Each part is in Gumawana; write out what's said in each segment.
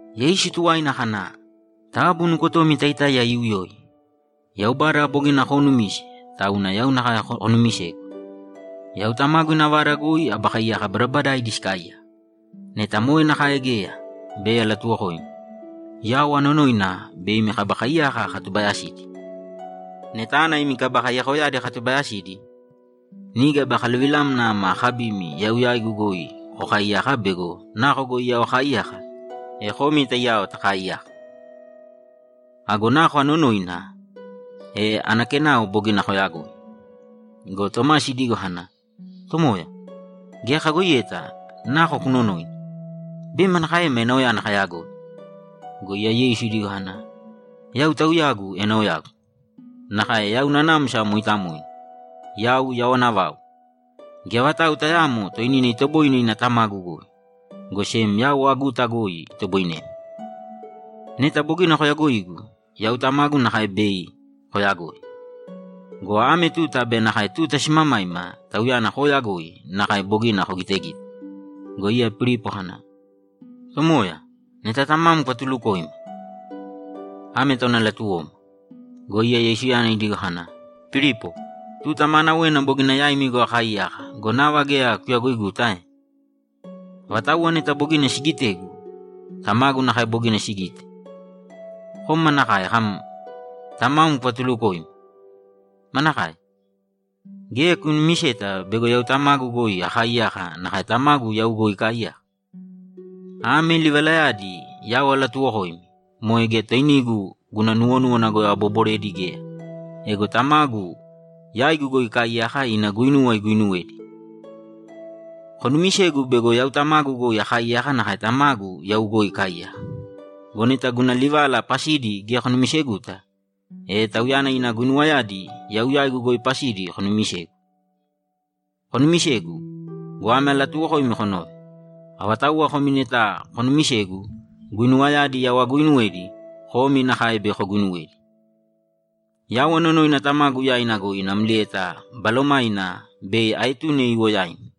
Yeisu tuwaina kana, ‘Taabu nukotomi taitáiya iiuyōi. Yaubada bogina koonumise, tauna yau nakae konuumisēgu. Yau Tamagu ina vada goi aba kaiyaka badabadaidi sikaaiyaka. Neta moe nakae geya, bei alatuwokoimi. Yau anonoina bei imi kaba kaiyaka akatubayasidi. Neta ana imi kaba kaiyakoyadi akatubayasidi, niga bei akaluvilamna ama akabimi yau yaigu goi kokaaiyaka bego nako goi yau akaaiyaka, e komi taiyao takaaiyaka. Ago nako anonoina, e ana kenao bogina koyagoi.’ Go Tomasi idigo kana, ‘Tomoya, geya kayagoiyeta nako kunonoina. Bei manakaema enaoyana kayagoi?’ Go iya Yeisu idigo kana, ‘Yau Tauyagu enaoyagu, nakae yau Nanamsa Mooitamoina, yau yawana vau. Geya vatau tayaamo toinina itoboine ina Tamagu goi, go sem yau aguta goi itoboinemi. Neta bogina koyagoigu, yau Tamagu nakae bei koyagoi. Go ame tuta be nakae tuta simamaima Tauyana kooyagoi nakae bogina kogitegite.’ Go iya Pilipo kana, ‘Tomoya, neta Tamam kuvatulukōima. Ame tauna latuwoma.’ Go iya Yeisuyana idigo kana, ‘Pilipo, tuta maanawena bogina yaimi goi akaaiyaka go, nava geya kuyagoiguta ae? Avatauwa neta bogina sigitegu, Tamagu nakae bogina sigite. Kom manakae kam, “Tamam kuvatulukōima?” Manakae? Geya kunumiseta bego yau Tamagu goi akaaiyaka nakae Tamagu yau goi ikaaiyaka? Ame livalayadi yau alatuuwokoimi moe geya toinigu guna nuwonúwana goi aboboredi geya. Ego Tamagu yaigu goi ikaaiyaka ina guinuwa iguinuwedi. Konumisēgu bego yau Tamagu goi akaaiyaka nakae Tamagu yau goi ikaaiyaka. Go neta guna livala pasidi geya konumiseguta, e Tauyana ina guinuwayadi yau yaigu goi pasidi konumisegu. Konumisēgu go, ame alatuuwokoimi konōve: Avatauwa komi neta konuumisegu, guinuwayadi yau aguuinuwedi, komi nakae bei koguinuwedi. Yau anonoina Tamagu yaina goi namlieta Balomaina bei aetune iwo yaimi,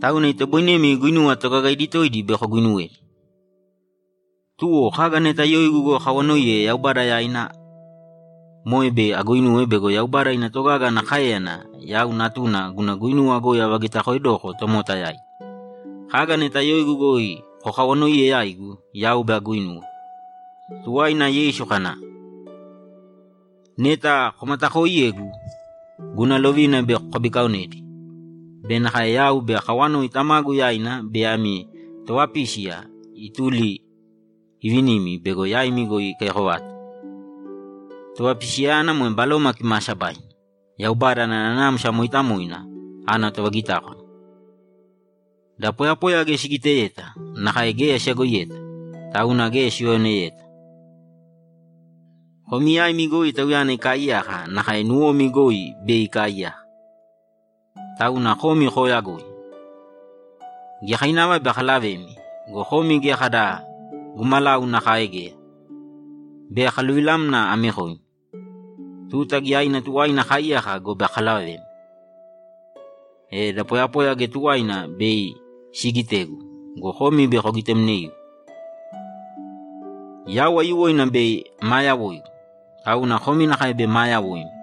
tauna itoboinemi guinuwa toogagaidi toidi bei koguinuwedi. Tuwo, kaga neta yoigu goi kokawanoiye Yaubada yaina, moe bei aguinuwe bego Yaubada ina togaga ana káeyana yau Natuna guna guinuwa goi avagitakoedoko tomota yaidi. Kaga neta yoigu goi kokawanoiye yaigu, yau bei aguinuwe.’ Tuwaina Yeisu kana, ‘Neta komatakooiyegu, guna lovina bei kokabikaaonedi be nakae yau bei akawanoi Tamagu yaina bei ami Tovapísiya ituli ivinimi bego yaimi goi ikaiyako vata. Tovapisiyayana moe Baloma Kimaasabaina, Yaubada ana Nanamsa Mooitamoina ana tovagitákwana. Da poyapoya geya sigiteyeta nakae geya siyagoiyeta, tauna geya siuyaoneyeta. Komi yaimi goi Tauyana ikaaiyaka nakae nuwomi goi bei ikaaiyaka, tauna komi kooyagoi. Giyakainava bei akalavemi go, komi geya kada gumalau nakae geya. Bei akaluvilamna amekoimi. Tuta giyaina tuwaina akaaiyaka gobe akalavemi, e da poyapoya geya tuwaina bei siigitegu go, komi bei kogitemneigu. Yau aiyuwoina bei maa yawoigu, tauna komi nakae bei maa yawoimi.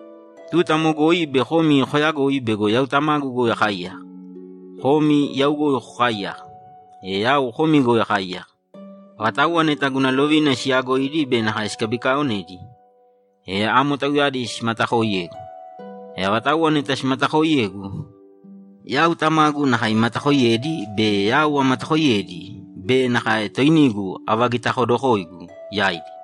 Tuta amo goi bei komi koyagoi bego yau Tamagu goi akaaiyaka, komi yau goi kokaaiyaka, e yau komi goi akaaiyaka. Avatauwa neta guna lovina siyaagoidi be nakae sikabikaaonedi, e amo tauyadi simatakooiyegu. E avatauwa neta simatakooiyegu, yau Tamagu nakae imatakoiyedi be yau amatakoiyedi be nakae toinigu avagitakodokoigu yaidi.’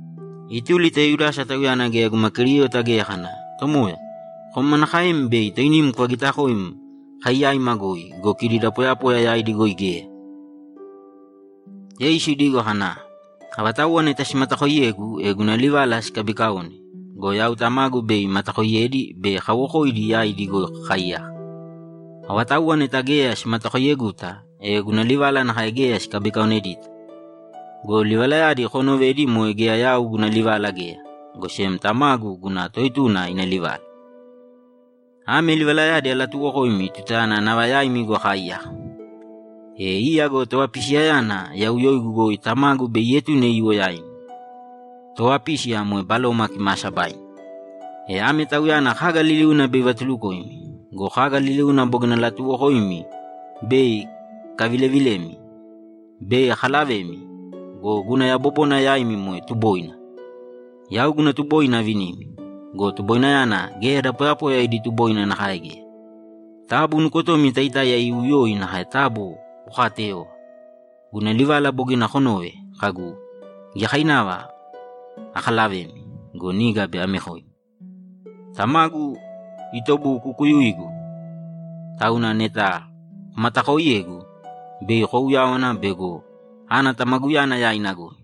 Ituli ta Yudasa (tauyana geya guma Keriota geya) kana, ‘Tomoya, kom manakaem bei toinim kuvagitakoim kai yaima goi go, kidi da poyapoya yaidi goi geya?’ Yeisu idigo kana, ‘Avatauwa neta simatakooiyegu, e guna livala sikabiikaone go, yau Tamagu bei imatakoiyedi be kawokoidi yaidi goi kakaaiyaka. Avatauwa neta geya simatakoiyeguta, e guna livala nakae geya sikabikaonedita. Go livalayadi koonovedi moe geya yau guna livala geya, go sem Tamagu guna Toetuna ina livala. Ame livalayadi alatuuwokoimi tutayana nava yaimi goi akaaiyaka. E iya go Tovapisiyayana yau yoigu goi Tamagu bei ietune iwo yaimi. Tovapísiya moe Baloma Kimaasabaina. E ame Tauyana kaga liliuna bei ivatulukoimi go, kaga liliuna bogina alatuuwokoimi bei ikavilevilemi. Bei akalavemi go, guna yabobona yaimi moe tuboina. Yau guna tuboina avinimi. Go tuboinayana geya da poyapoya idi tuboina nakae geya. Taabu nukotomi taitáiya iiuyōi nakae taabu kokaateyōva. Guna livala bogina konove kagu, “Giyakainava akalavemi go, niga bei amekoimi.” Tamagu itobukukuyuigu, tauna neta komatakooiyegu, bei kouyáwana bego ana Tamaguyana yaina goi.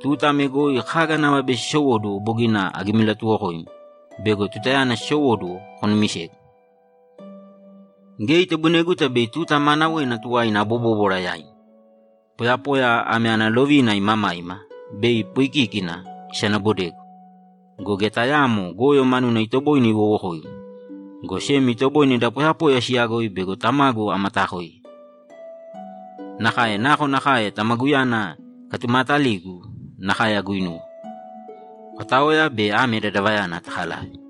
Tuta ame goi kaga nava bei sisowóduwo bogina agimilatuwokoimi bego tutayana sisowóduwo, konumisegu. Geya itoboineguta bei tuta maanawena tuwaina abobóbwara yaimi. Poyapoya ame ana tolovina imamaima bei ipoikíkina isanabodegu go, geya tayaamo goyo manuna itoboine iwowokoigu, go sem itoboine da poyapoya siyagoi bego Tamagu amataakoiye. Nakae nakonakae Tamaguyana ikatumaataligu, nakae aguuinuwe. Kotāoya be ame dadavayana takalāve.’